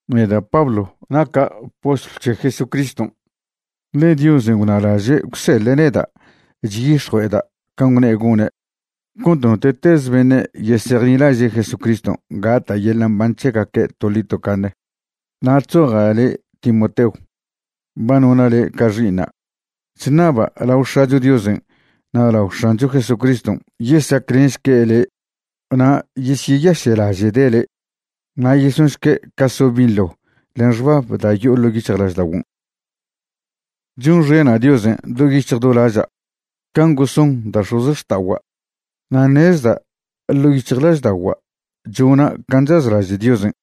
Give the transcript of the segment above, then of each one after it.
Neda' Pablo naca' postlw c̱he Jesucriston', ḻe Diosen' gwnalaže' gwseḻe' neda' chyix̱jue'eda' can' gwne' gone' cont note'teze beṉe' yesejnilaže' Jesucriston' gata' yeḻa' mban c̱hegaque' toḻi tocaṉe. Na' chzoja' le' Timoteo, ba nona' le' ca xi'iṉa'. Chṉaba' lao X̱acho Diosen' na' lao X̱ancho Jesucriston' yesaclenšque' le' na' yesyeyaše'laže'de' le', na' yesonšque' ca so' binḻo len xbab da' yo'o ḻo' yic̱hjlažda'oguon'. Chonxena' Diosen' do yic̱hj do laža' can' goson da' x̱ozxta'ogua', na' ṉezda' ḻo' yic̱hjlažda'ogua' chona' can' chazlaže' Diosen'.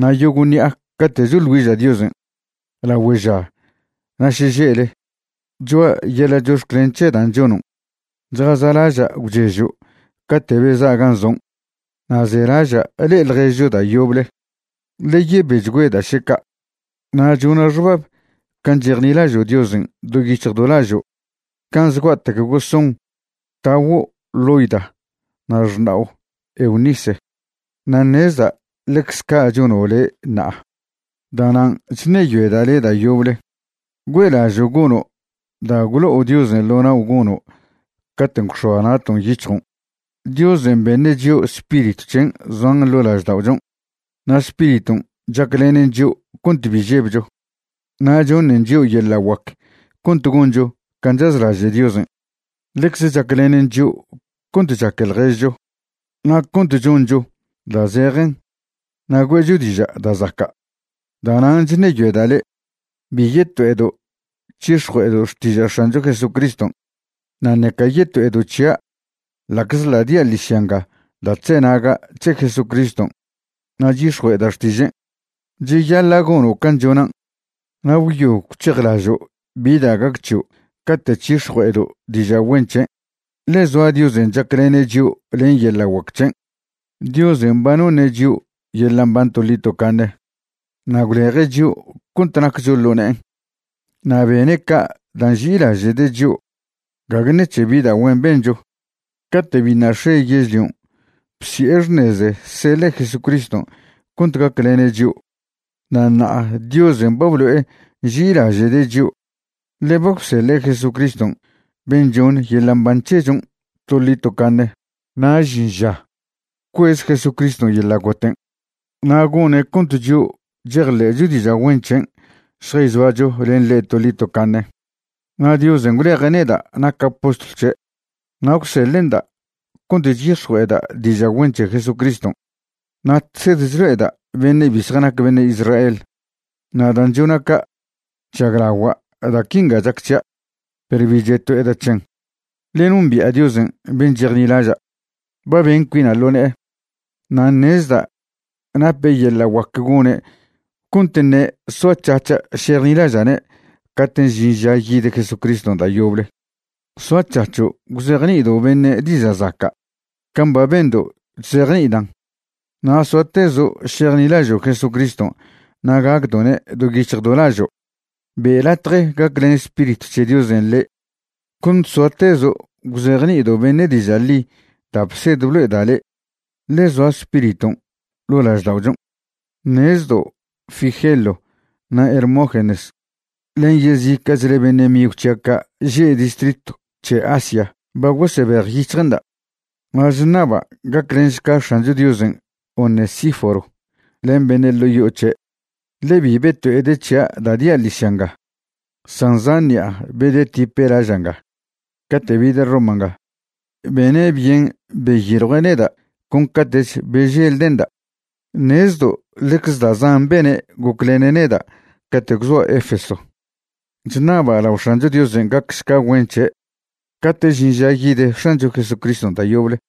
Na' yogo' ṉi'a cate' choḻ güiža' Diosen', lagüe ža na' šeže'le, choa' yeḻa' chox̱clen c̱he dan' chonon'. Chjaza'laža' gwchežo' cate' beza' gan' zon', na' zelaža' le'e ḻježcho da' yoble, ḻe yebechgüeda' še ca'. Na' chona' xbab can' chejnilažo' Diosen' do yic̱hj do lažo' can' zgua'tec goson taguo' Loida na' xṉa'o Eunice, na' ṉezda' ḻecz ca' chono' le' ṉa'a. Da'nan' chṉeyoeda' le' da' yoble, güe'lažo' gono' da' gwlo'o Diosen' ḻo nao' gono' caten' gwx̱oa na'ton' yic̱hjon'. Diosen' beṉe' chio' Spiritw c̱hen' zoan ḻo' lažda'ochon', na' Spiriton' chaclenen chio' cont bi žebcho, na' choṉen chio' yeḻa' guac cont goncho can' chazlaže' Diosen'. Ḻecze chaclenen chio' cont chaque ḻježcho na' cont choncho da' zejen na' güe'cho diža' da' zaca'. Da'nan' chṉeyoeda' le', bi yeto'edo' c̱hix̱jue'edo' xtiža' X̱ancho Jesucriston', na' ṉeca yeto'edo' c̱hia' ḻa'czḻa' dia' ḻižya nga da' chzenaga' c̱he Jesucriston' na' chyix̱jue'eda' xtižen'. Cheyaḻa' gono' can' chonan' na' gwyo gwc̱hejlažo' bi da' gac c̱hio' cate' c̱hix̱jue'edo' diža' güen c̱hen', ḻe zoa Diosen' chaclene' chio' len yeḻa' guac c̱hen'. Diosen' ba noṉe' chio' yeḻa' mban toḻi tocaṉe na' gwleje' chio' cont naccho ḻo ne'en. Na' bene' ca' da' nži'ilaže'de' chio', gague ṉec̱he bi da' güen bencho. Cate' biṉa' x̱e yežlion' bsi'e xṉeze seḻe' Jesucriston' cont gaclene' chio'. Na' ṉa'a Diosen' ba blo'e nži'ilaže'de' chio', ḻe ba gwseḻe' Jesucriston' ben' choṉ yeḻa' mban c̱hechon' toḻi tocaṉe. Na' žin ža gwcuez Jesucriston' yeḻa' goten' na' gone' cont chio' chejḻe'cho diža' güen c̱hen' šjayzoacho len ḻe' toḻi tocaṉe. Na' Diosen' gwleje' neda' naca' postlw c̱he' na' gwseḻe'nda' cont chyix̱jue'eda' diža' güen c̱he Jesucriston' na' chsed chlo'eda' beṉe' bi zjanac beṉe' Israel. Na' dan' chona' ca', chžaglagua' da' quinga chac c̱hia', perw bi cheto'eda' c̱hen, ḻe nombi'a Diosen' ben' chejnilaža'. Ba ben cuina' ḻo ne'e, na' ṉezda' nape' yeḻa' guac gone' cont ṉe' soac̱hac̱ha' šejnilaža'ne' caten' žin ža yid Jesucriston' da' yoble. Soac̱hac̱ho' gwzejni'ido' beṉe' diža' zaca' can' ba bendo' chzejni'idan', na' soatezo' šejnilažo' Jesucriston' na' gacdo'ne' do yic̱hj do lažo'. Be' latje gaclen Spiritw c̱he Diosen' le' cont soatezo' gwzejni'ido' beṉe' diža' ḻi da' bsed blo'eda' le'e, ḻe zoa Spiriton' ḻo' lažda'ochon'. Ṉezdo' Figelo na' Hermógenes len yezica'chle beṉe' migw c̱hia' ca' že' distritw c̱he Asia ba gosebejyic̱hje'nda'. Na' chṉaba' gaclenšca X̱ancho Diosen' Onesíforo len beṉe' ḻo' yo'o c̱he', ḻe bi beto'ede' c̱hia' da' dia' ḻižya nga, san zan ṉi'a bedetipe' laža' nga. Cate' bide' Roma nga, bene' byen beyiljue' neda' con cate'ch beželde'nda'. Ṉezdo' ḻecze da' zan bene' goclene' neda' cate' gwzoa' Efeso. Chṉaba' lao X̱ancho Diosen' gacšca güen c̱he' cate' žin ža yid X̱ancho Jesucriston' da' yoble.